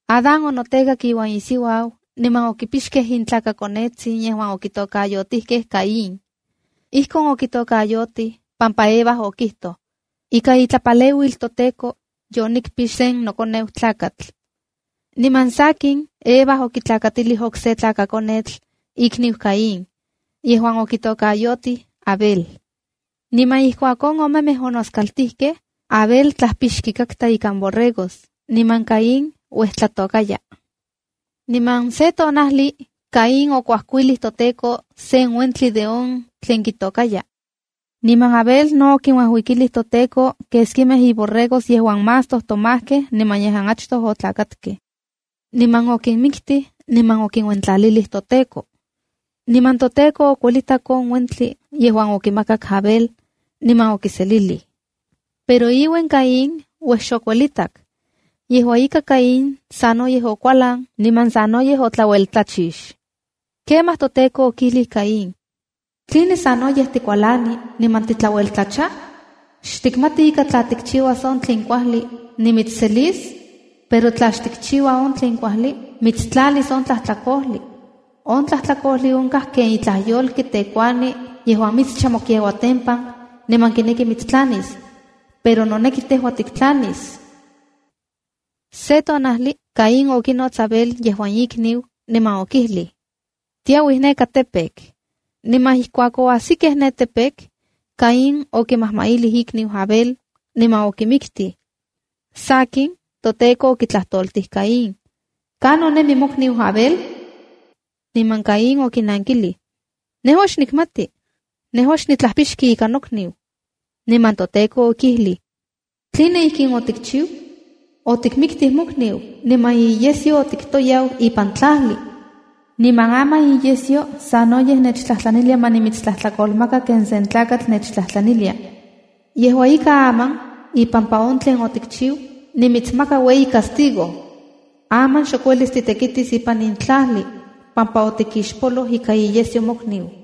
Adán notekak iuan isiuau niman okipixkej intlakakonetsin yejuan okitokayotikej Caín. Ijkon okitokayotij pampa Eva okijtoj: “Ika itlapaleuil toTEKO, yonikpix sen nokoneu tlakatl.” Niman sakin, Eva okitlakatilij okse tlakakonetl ikniu Caín, yejuan okitokayotij Abel. Niman ijkuak on omemej onoskaltijkej, Abel tlapixki katka ikan borregos, niman Caín uejtlatôkaya. Niman se tonajli Caín okuajkuilij toTEKO sen uentli de on tlen kitokaya. Niman Abel no okinuajuikilij toTEKO keskimej iborregos yejuan más tojtomajkej niman yejuan achtoj otlakatkej. Niman okinmiktij niman okinuentlalilij toTEKO. Niman toTEKO okuelitak on uentli yejuan okimakak Abel, niman okiselilij. Pero iuen Caín uej xokuelitak. Yejua ika, Caín sanoyej okualan niman sanoyej otlaueltlachix. Kemaj toTEKO okijlij Caín: “¿Tline sanoyej tikualani niman titlaueltlacha? ¿Xtikmati ika tla tikchiuas on tlen kuajli, nimitsselis? Pero tla xtikchiua on tlen kuajli, mitstlanis on tlajtlakojli. On tlajtlakojli onkaj ken itlaj yolki tekuani yejuan mitscha mokiauatempan niman kineki mitstlanis. Pero noneki tejua tiktlanis.” Se tonajli Caín okinots Abel, yejuan ikniu, niman okijlij: —Tiauij neka campo. Niman ijkuak oajsikej ne campo, Caín okimajmailij ikniu Abel niman okimiktij. Sakin, toTEKO okitlajtoltij Caín: —¿Kanon nemi mokniu Abel? Niman Caín okinankilij: —Nejua xnikmati. Nejua xnitlajpixki ika nokniu. Niman toTEKO okijlij: —¿Tline ijkin otikchiu? Otikmiktij mokniu niman iyesyo otiktoyau ipan tlajli. Niman aman iyesyo sanoyej nechtlajtlanilia ma nimitstlajtlakolmaka ken sen tlakatl nechtlajtlanilia. Yejua ika, aman, ipampa on tlen otikchiu, nimitsmaka ueyi castigo. Aman xok uelis titekitis ipan in tlajli, pampa otikixpoloj ika iyesyo mokniu.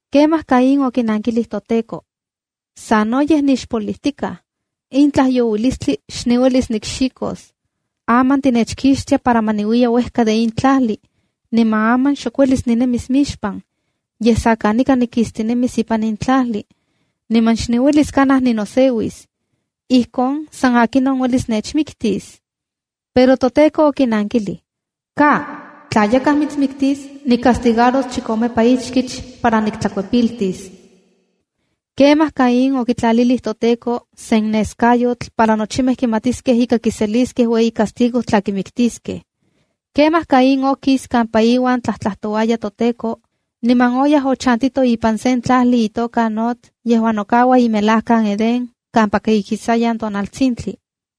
Kemaj Caín okinankilij toTEKO: —Sanoyej nixpolijtikaj. ¡In tlajyouilistli xniuelis nikxikos! Aman tinechkixtia para ma niuiya uejka de in tlajli, niman aman xok uelis ninemis mixpan. Yej sa kanika nikistinemis ipan in tlajli, niman xniuelis kanaj ninoseuis. Ijkon san akinon uelis nechmiktis. Pero toTEKO okinankilij: —¡Ka! Tla yakaj mitsmiktis, nicastigaros chikomepa ichkich más para niktlakuepiltis. Kemaj toTEKO okitlalilij Caín sen neskayotl para nochimej kimatiskej ika kiseliskej ueyi castigo tla kimiktiskej. Kemaj Caín okis kampa iuan tlajtojtikatka toTEKO, niman oyaj ochantito ipan sen tlajli itoka Noda yejuan nokaua imelajkan Edén kampaka ikisayan tonaltsintli.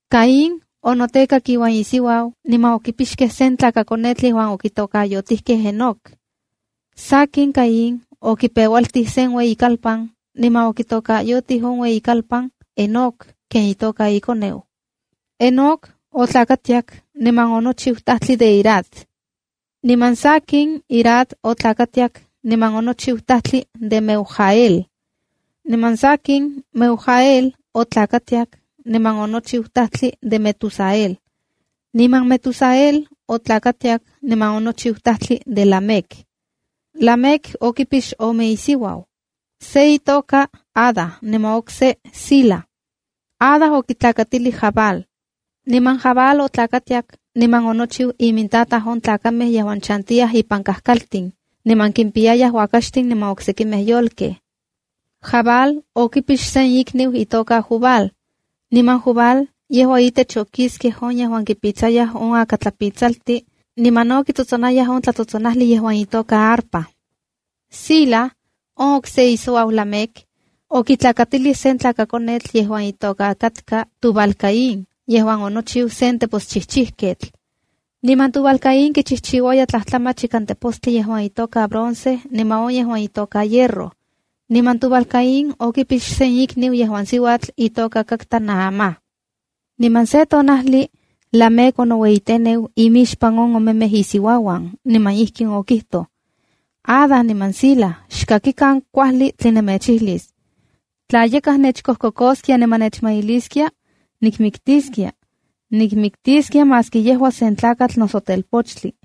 Caín onotekak iuan isiuau niman okipixkej sen tlakakonetl yejuan okitokayotijkej Enoc. Sakin, Caín okipeualtij sen ueyikalpan, niman okitokayotij on ueyikalpan Enoc ken itoka ikoneu. Enoc otlakatiak niman onochiu tajtli de Irad. Niman sakin, Irad otlakatiak niman onochiu tajtli de Meujael. Niman sakin, Meujael otlakatiak niman onochiu tajtli de Metusael. Niman Metusael otlakatiak niman onochiu tajtli de Lamec. Lamec okipix ome isiuau: se itoka Ada niman okse Zila. Ada okitlakatilij Jabal. Niman Jabal otlakatiak niman onochiu imintataj on tlakamej yejuan chantiyaj ipan kajkaltin, niman kimpiyayaj uakaxtin niman oksekimej yolkej. Jabal okipix sen ikniu itoka Jubal. Niman Jubal yejua itech okiskej on yejuan kipitsayaj on akatlapitsaltin niman no kitsotsonayaj on tlatsotsonajli yejuan itoka arpa. Zila, on okse isiuau Lamec, okitlakatilij sen tlakakonetl yejuan itoka katka Tubal-caín yejuan onochiu sen teposchijchijketl. Niman Tubal-caín kichijchiuaya tlajtlamach ikan tepostli yejuan itoka bronce niman on yejuan itoka hierro. Niman Tubal-caín okipix sen ikniu yejuan siuatl itoka katka Naamá. Niman se tonajli Lamec onoueyiteneu imixpan on omemej isiuauan, niman ijkin okijtoj: q “Ada niman Zila, xkakikan kuajli tlen nemechijlis. Tla yakaj nechkojkokoskia noso nechmailiskia, nikmiktiskia. Nikmiktiskia maski yejua sen tlakatl noso telpochtli.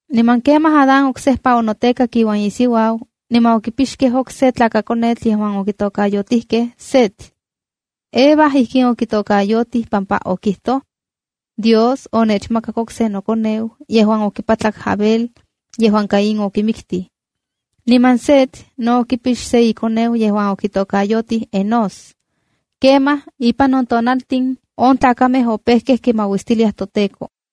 Niman kemaj Adán oksejpa onotekak iuan isiuau niman okipixkej okse tlakakonetl yejuan okitokayotijkej Set. Eva ijkin okitokayotij pampa okijtoj: “Dios onechmakak okse nokoneu yejuan okipatlak Abel yejuan Caín okimiktij.” Niman Set no okipix se ikoneu yejuan okitokayotij Enós. Kemaj ipan on tiempo on tlakamej opejkej kimauistiliaj toTEKO.